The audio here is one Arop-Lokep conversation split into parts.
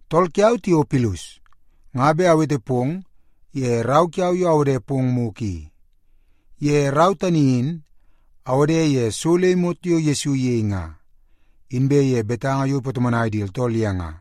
Tool kiau, Tiopilus, nga bet awete pong ye rau kiau yo awode pong mugu i. Ye rau tani in awode ye so le imot yo Yesu iyei nga, inbe ye betanga yo ipatomonai di tooltool ye nga,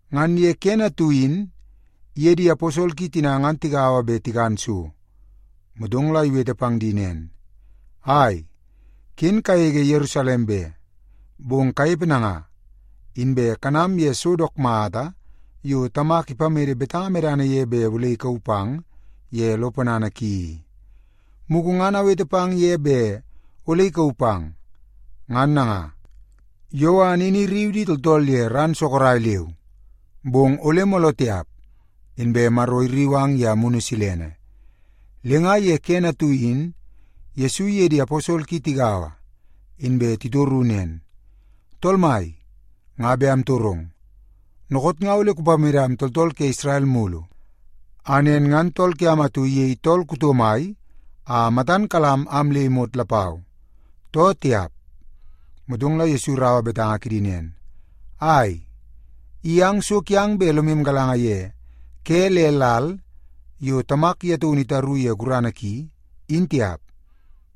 Ngan ye kene atu in iye di aposol ki tina ngan tigaua bet tikan so, motong la iwete pang di nen, “Ai, ken kagege Yerusalem be. Bong kanepe nanga, inbe kanam ye so dook mata yo Tamak ipamede betanga medana ye bet ole ikauu pang ye lo ponana ki i. Mugu ngan awete pang ye bet ole ikauu pang. Ngan nanga, Yowan in irriu di tooltool ye ran sorok leu, bong ole mooloo tiap, inbe Maro irriu ang ye Amunu Silene.” Le nga ye kene atu in Yesu iye di aposol ki tigaua, inbe titoru nen, “Tool Mai, nga bet amtorong. Dookoot nga ole kupamedam tooltool ke Isrel mulu a nen ngan tool kiam atu iyei tool kuto mai a matan kalam am le imot lapau, too tiap?” Motong la Yesu iraua betanga kidi nen, “Ai, i ang so kiang bet lomu galanga ye ke le lal yo Tamak ye taunu itaru ye gurana ki, in tiap.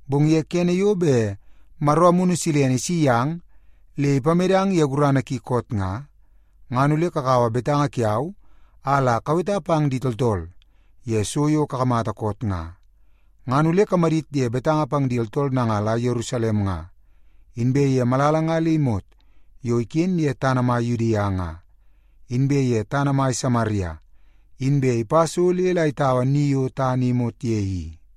Bong ye kene yo bet Maro Amunu Silene isi yang le ipamedang ye gurana ki koot nga, ngan ole kakaua betanga kiau a la kaweta pang di tooltool ye so yo kakamata koot nga. Ngan ole kamadit ye betanga pang di tooltool nanga la Yerusalem nga, inbe ye malala nga le imot yo iken ye tana mai Yudia nga, inbe ye tana mai Samaria, inbe ipa so le la itaua ni yo tana i imot ye i.”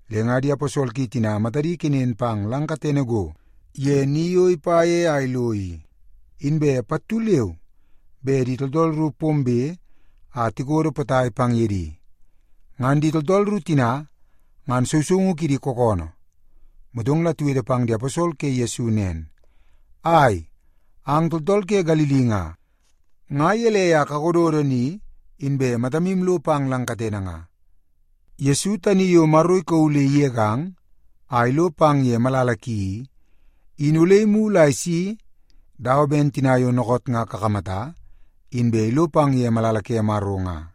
Le nga di aposol ki tina matadi kenen pang lang katene go ye ni yo ipa ye a ilo i, inbe pattu leu be di tooltool ru pombe a tikodo potai pang ye di. Ngan di tooltool ru tina ngan sousoungu kidi kookoonoo. Motong la tiwete pang di aposol ke Yesu nen, “Ai, ang tooltool ke Galili nga, nga gelei a kakododo ni, inbe matamu lo pang lang katene nga? Yesu tani yo Maro ikauu le igegang a ilo pang ye malala ki i, in ole imulu a isi dawa ben tina yo dookoot nga kakamata inbe ilo pang ye malala ke Maro nga.”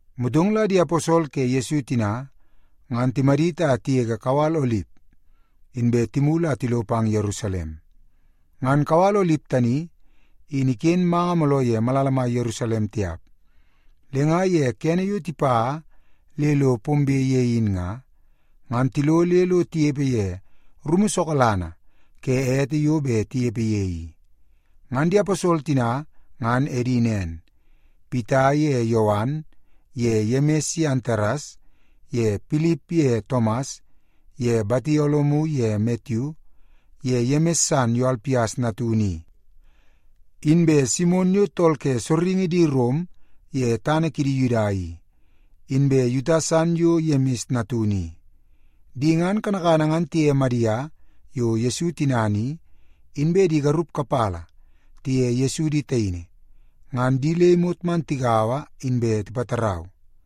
Motong la di aposol ke Yesu tina, ngan timadit a tigege kawal Olip, inbe timulu a tilo pang Yerusalem. Ngan kawal Olip tani in iken manga mooloo ye malala mai Yerusalem tiap. Le nga ye kene yo tipa le lo pombe ye in nga, ngan tilo le lo tinepe ye rumu sokalana ke ete yo bet tinepe ye i. Ngan di aposol tina ngan edi nen; Pita ye Yowan ye Yemis ye Antares ye Pilip ye Tomas ye Batolomiu ye Matiu ye Yemis san yo Alpias natunu i, inbe Simon yo tool ke sorringi di Rom ye tana kidi Yuda i, inbe Yuta san yo Yemis natunu i. Di ngan kanakana ngan tiye Madia yo Yesu tinana i, inbe di garup kapala tiye Yesu di taini, ngan di le imot man tigaua inbe tipatarau.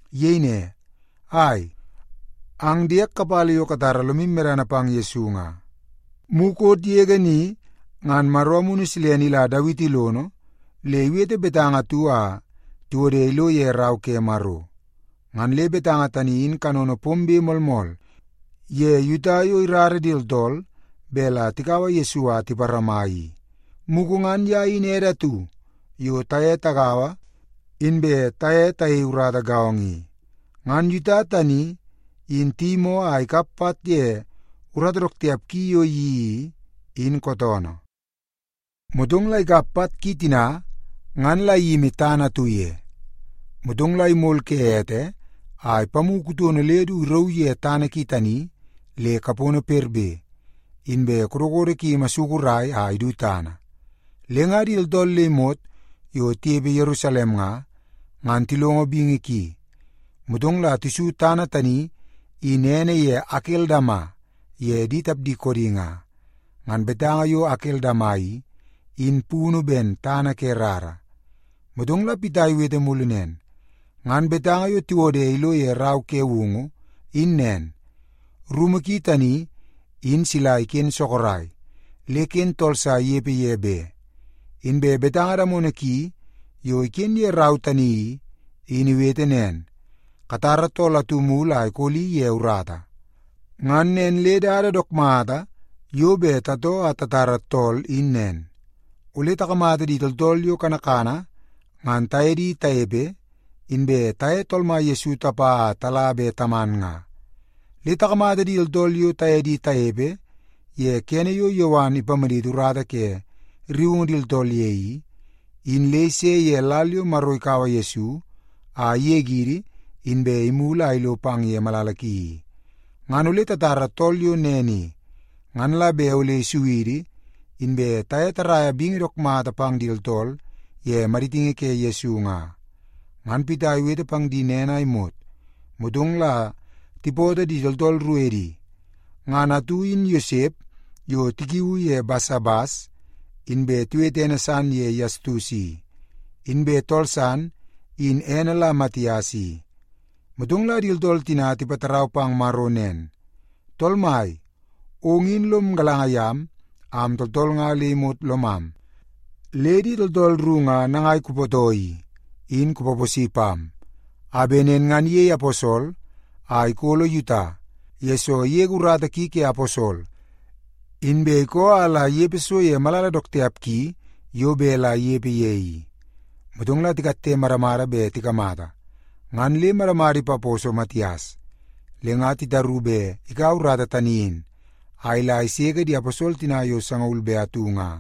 Iyei ne, “Ai, ang diek kapala yo katara lomu medana pang Yesu nga, mukot yege ni ngan Maro Amunu Silene ila Dawiti lono le iwete betanga atu a tiwode ilo ye Rau ke Maro. Ngan le betanga tani in kanono pombe moolmool ye Yuta yo irara di tooltool bet la tikaua Yesu a tiparama i. Mugu ngan ye in ede atu yo taye tagaua inbe taye tayei urata gaongo i.” (Ngan Yuta tani in tiyimoo a ikap pat ye urata dook tiap ki yo iyeii i, in kootoonoo. Motong la ikap pat ki tina ngan la iyimi tana atu ye. Motong la imol ke ete a ipamu kutono le du irauu ye tana ki tani le kapono perbe, inbe kodokodo ki imasukurai a idu tana. Le nga di tooltool le imot yo tinepe Yerusalem nga, ngan tilongo bingi ki, motong la tisu tana tani in ene ye Akeldama ye di tapdi koodi nga. Ngan betanga yo Akeldama i, in punu ben, Tana Ke Rara.) Motong la Pita iwete mulu nen, “Ngan betanga yo tiwode ilo ye Rau ke Woungu in nen, ‘Rumu ki tani in sila iken sorok. Le ken tooltool sa inepe ye be.’ Inbe betanga damono ki yo iken ye rau tani i, in iwete nen, ‘Katara tool atu mulu a ikoli ye urata.’ “Ngan nen le dada dook mata yo bet tatoo a tatara tool in nen. Ole takamata di tooltool yo kanakana ngan taye di tanepe, inbe taye Tool Mai Yesu tapa a tala be taman nga. Le takamata di tooltool yo taye di tanepe ye kene yo Yowan ipamaditi urata ke rriungu di tooltool ye i, in le ise ye lal yo Maro ikaua Yesu a igegidi inbe imulu a ilo pang ye malala ki i. Ngan ole tatara tool yo nen i, ngan la bet ole isu idi inbe taye taraia bingi dook mata pang di tooltool ye maditingi ke Yesu nga.” Ngan Pita iwete pang di nen a imot, motong la tipootoo di tooltool ru edi. Ngan atu in Yosep yo tikiuu ye Basabas, inbe tiwete ene san ye Yastus i, inbe tool san in ene la Matias i. Motong la di tooltool tina tipatarau pang Maro nen, “Tool Mai, ong in lom galanga yam am tooltool nga le imot lomam. Le di tooltool ru nga nangai kupootoo i, in kupaposi pam a bet nen ngan iyei aposol a ikolo Yuta, yesoo igege urata ki ke aposol, inbe ikoo a la inepe so ye malala dook tiap ki yo bet la inepe ye i.” Motong la tikatte madamada bet tikamata, ngan le madamada ipaposo Matias. Le nga titaru bet ikaua urata tani in a ila iseke di aposol tina yo sangaul be atu nga.